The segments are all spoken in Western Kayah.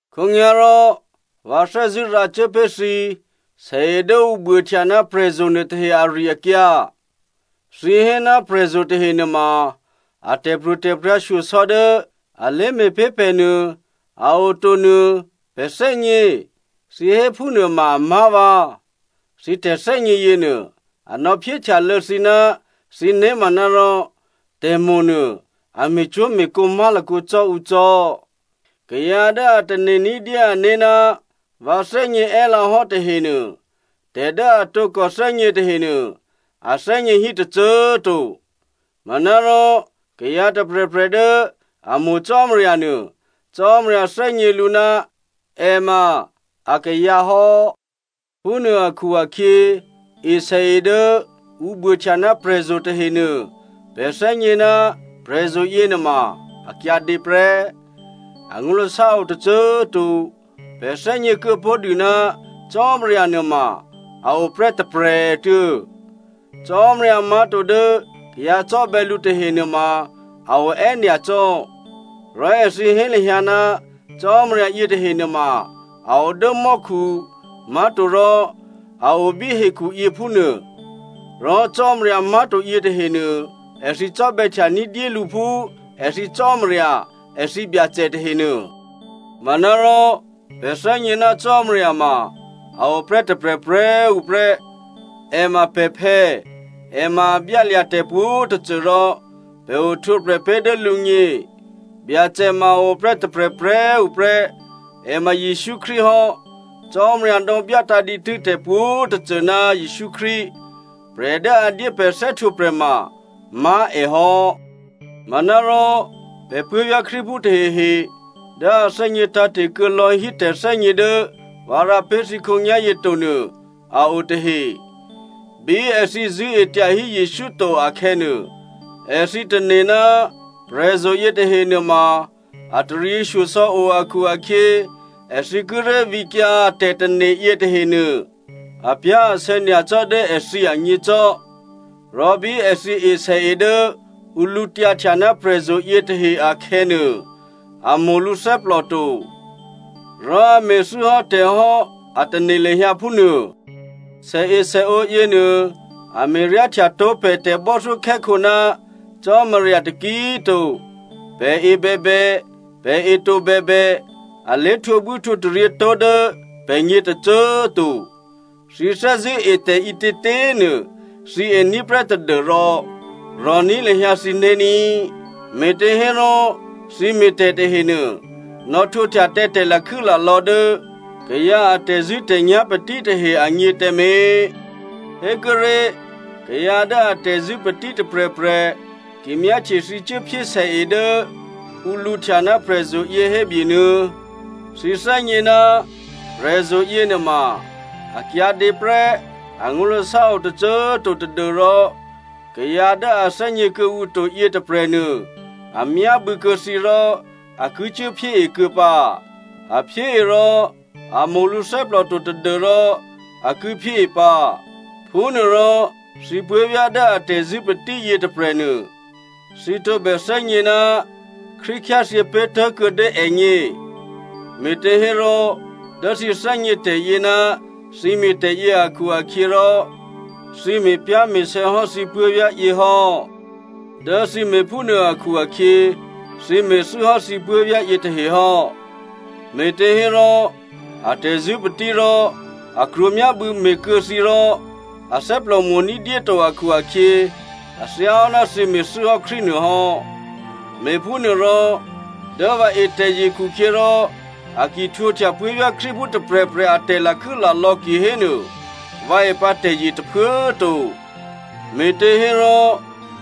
Khǒnyá̤rò vǎ thè́zṳ̂́ rǎcuố pé̤ thǐ sèe dố ǔ buôhtya ná prè̤zo̤ nuôtahe ari-akyǎ. Thǐ hé ná prè̤zo̤ tahe nuôma a tè̤pro̤tè̤prya̤ shyosò̌ dố a lé̤me̤pé̤ pè̤ nuô a o to nuô pè̤ thè́gně, thǐ hé phúnuô ma amá̤ vǎ. Thǐ tè̤thè́gně yěnuô, a nò̌phyéhtyalô̌ thǐ ná thǐ né̤ manárò tè̤mo̤ nuô a me̤cwó̤me̤kǒ má̤lakǒ cò́ ǔ cò́. Kayǎ dố a tane̤ ní̤dyé ané̤ ná vǎ thè́gně è́lǎ hò́ tahenuô, tè̤ dố a tǒkò thè́gně tahenuô, a thè́gně hí tôcô꤮ to. Manárò kayǎ tôprè̤prè̤ dố a mo̤ Cò́marya nuô, Cò́marya thè́gně lǔ ná è ma akayǎ hò́. Phúnuô akhu-akhyě, esèe dố ǔ buôhtya ná prè̤zo̤ tahenuô, pè̤ thè́gně ná prè̤zo̤ yěnuôma a kyǎdě prè́, angó̤lasá o tôcô꤮ to. Pè̤ thè́gně kuô̌ pó̤ dû ná Cò́marya nuôma a o prè́ tôprè̤꤮ tuô̌. Cò́marya má̤to dố kayǎ cò́bè̌ lǔ tahe nuôma a o è́nyacò́. Rò èthǐ hé lahyǎ, cò́marya yětahe nuôma a o dố mò́khu, má̤torò a o bí hekhu yě, phúnuô. Rò cò́marya má̤to yětahenuô èthǐ cò́bè̌htya ní̤dyé lǔ phú èthǐ cò́marya, èthǐ byacè tahenuô. Manárò pè̤ thè́gně ná Cò́marya ma a oprè́ tôprè̤prè̤꤮ tuô̌ prè́. È ma pè̤phè̌, è ma a byálya̤ tè̤pwǒ̤꤮ tôcô rò pè̤ ohtwǒprè̤ pé̤ dố lǔgně. Byacè ma a oprè́ tôprè̤prè̤꤮ tuô̌ prè́, è ma Jesǔ Krístu hò́. Cò́marya nò̌byátǎ̤ dǐtû́ tè̤pwǒ̤꤮ tôcô ná Jesǔ Krístu. Prè̤ dố a dyé pè̤ thè́htwǒprè̤ ma má̤ è hò́. Manárò, pè̤ puố̤vyá̤ Krístuphú tahehe dố a thè́gně tǎ̤te̤ kuô̌ lò̌ hí tè̤thè́gně dố vǎ rǎ pé̤ thǐ khǒnyá̤yě to nuô a o tahe. Bí èthǐ zṳ̂́e tyahí Jesǔ to akhè̌nuô, èthǐ tane̤ ná prè̤zo̤ yětahe nuôma a taryěshyosò̌ o akhu-akhyě èthǐ kíré̤ vǐkyǎ a tè̤tane̤ yětahenuô, apyá̤asè̌ nyacò́ dố èthǐ agně cò́. Rò bí èthǐ esèe dố ǔ lǔtyǎhtya ná prè̤zo̤ yětahe akhè̌nuô, a mo̤ lǔthè́plò to, rò a me̤thû́ hò́ tè̤ hò́ a tane̤ lahyǎ phúnuô. Sèesèǒ yěnuô a me̤ryáhtyató̤ pè̤ tè̤bò́thyókhè́khǒ ná Cò́marya taki꤮ to. Pè̤ e bèbè, pè̤ e to bèbè, a lé̤htwǒbwí htwǒtaryě tó̤ dố pè̤gně tôcô꤮ to. Thǐ thè́zṳ̂́ e tè̤ ǐtětě꤮ nuô thǐ ení̤ prè́ tadû́rò, rò̤ní̤ lahyǎ thǐné̤ ní꤮. Me̤těhérò thǐ me̤ tè̤ tahenuô, nò̌htwǒhtya tǎ tè̤lakhû́lalò̌ dố kayǎ a tè̤zṳ̂́tè̤nyá̤ patí tahe agně tǎmé̤. Hékuốré̤, kayǎ dố atè̤zṳ̂́ patí tôprè̤prè̤ ki myáhtye thǐ cuố phyé esè dố ǔ lǔhtya ná prè̤zo̤ yě, hébyenuô̌. Thǐ thè́gně ná prè̤zo̤ yěnuôma a kyǎdě prè́, angó̤lasá o tôcô꤮ to tadû́rò kayǎ dố a thè́gně kuô̌ǔ to yětôprè̤nuô a myábû̌ kuô̌ thǐ rò a ki cuốphyée kuô̌ pǎ. A phyée rò a mo̤ lǔthè́plò to, tadû́rò a ki phyée pǎ. Phúnuôrò thǐ puố̤vyá̤ dố atè̤zṳ̂́ patí yětôprè̤nuô, thǐ tǒbè thè́gně ná Krístu khyáthyě pé̤ tố̤kuô̌ dố ègně. Me̤těhérò dố thǐ thè́gně tè̤yě ná thǐ me̤tè̤ yě akhu-akhyěrò thǐ me̤pyá̤me̤sè̌ hò́ thǐ puố̤vyá̤ yě hò́. Dố thǐ me̤phúnuô akhu-akhyě thǐ me̤thû́hò́ thǐ puố̤vyá̤ yětahe hò́. Me̤těhérò atè̤zṳ̂́ patí rò a krwǒ myábû̌ me̤kuô̌ thǐ rò athè́plò mo̤ ní̤dyé to akhu-akhyě, a thyá hò́ ná thǐ me̤thû́hò́ Krístu nuô hò́. Me̤phúnuôrò, dố vǎ e tè̤zye khukhyěrò a ki dyéhtwǒhtya puố̤vyá̤ Krístuphú tôprè̤prè̤ a tè̤lakhû́lalò̌ kihénuô, vǎ e pǎ tè̤zye tôphuố꤮ to. Me̤těhérò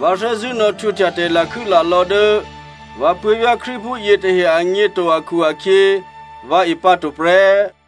vǎ thè́zṳ̂́ nò̌htwǒhtya tè̤lakhû́lalò̌ dố vǎ puố̤vyá̤ Krístuphú yětahe agně to akhu-akhyě, vǎ e pǎ to prè́.